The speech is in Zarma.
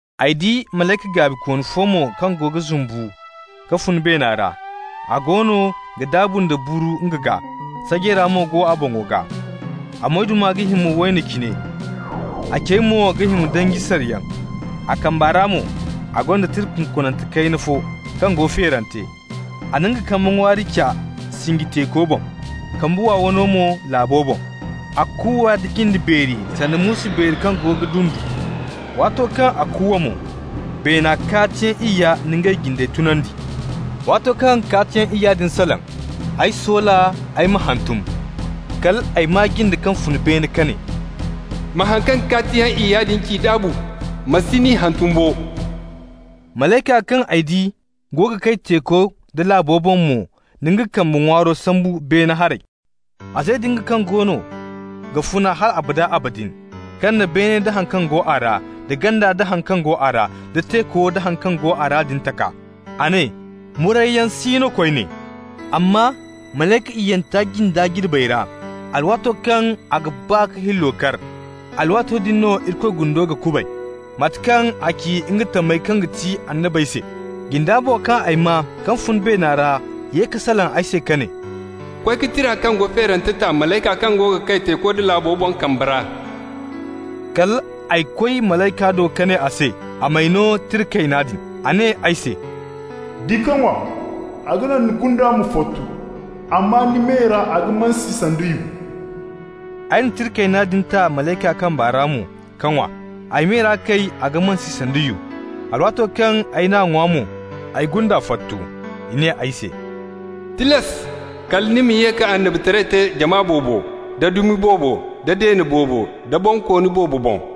Ay di malayka gaabikooni fo mo kaŋ goono ga zumbu ka fun beena ra. A goono ga daabu nda buru nga gaa. Sajeera mo go a boŋo gaa, a moyduma ga hima wayno cine, a cey mo ga hima danji sariyaŋ. A kamba ra mo a gonda tira kunkunante kayna fo kaŋ go feerante. A na nga kambe ŋwaari ca sinji teeko boŋ, kambe wow wano mo laabo boŋ. A kuuwa nda jinde beeri sanda muusu beeri kaŋ goono ga dundu. Waato kaŋ a kuuwa mo, beena kaatiyaŋ iyya na ngey jinde tunandi. Waato kaŋ kaatiyaŋ iyya din salaŋ, ay soola ay ma hantum. Kal ay maa jinde kaŋ fun beene ka ne: «Ma haŋ kaŋ kaatiyaŋ iyya din ci daabu, ma si n'i hantum bo.» Malayka kaŋ ay di go ga kay teeko da laabo boŋ mo na nga kambe ŋwaaro sambu beene haray. A ze nda nga kaŋ goono ga funa hal abada abadin, kaŋ na beene da haŋ kaŋ go a ra, da ganda nda haŋ kaŋ go a ra, da teeku nda haŋ kaŋ go a ra din taka. A ne: «Murayyaŋ si no koyne, amma malayka iyyanta jinda jirbey ra, alwaato kaŋ a ga ba ka hillo kar, alwaato din no Irikoy gundo ga kubay, mate kaŋ a ci nga tamey kaŋ ga ti annabey se.» Jinda mo kaŋ ay maa kaŋ fun beena ra ye ka salaŋ ay se ka ne: «Koy ka tira kaŋ go feerante ta malayka kaŋ go ga kay teeko da laabo boŋ kamba ra.» Kal ay koy malayka do ka ne a se a m'ay no tira kayna din. A ne ay se: «Di ka ŋwa. A ga naŋ ni gunda ma fottu, amma ni me ra a ga mansi sanda yu.» Ay na tira kayna din ta malayka kamba ra mo k'a ŋwa. Ay me ra kay a ga mansi sanda yu. Alwaato kaŋ ay n'a ŋwa mo, ay gunda fottu. I ne ay se: «Tilas kala ni ma ye ka annabitaray te jama boobo, da dumi boobo, da deene boobo da bonkooni boobo boŋ.»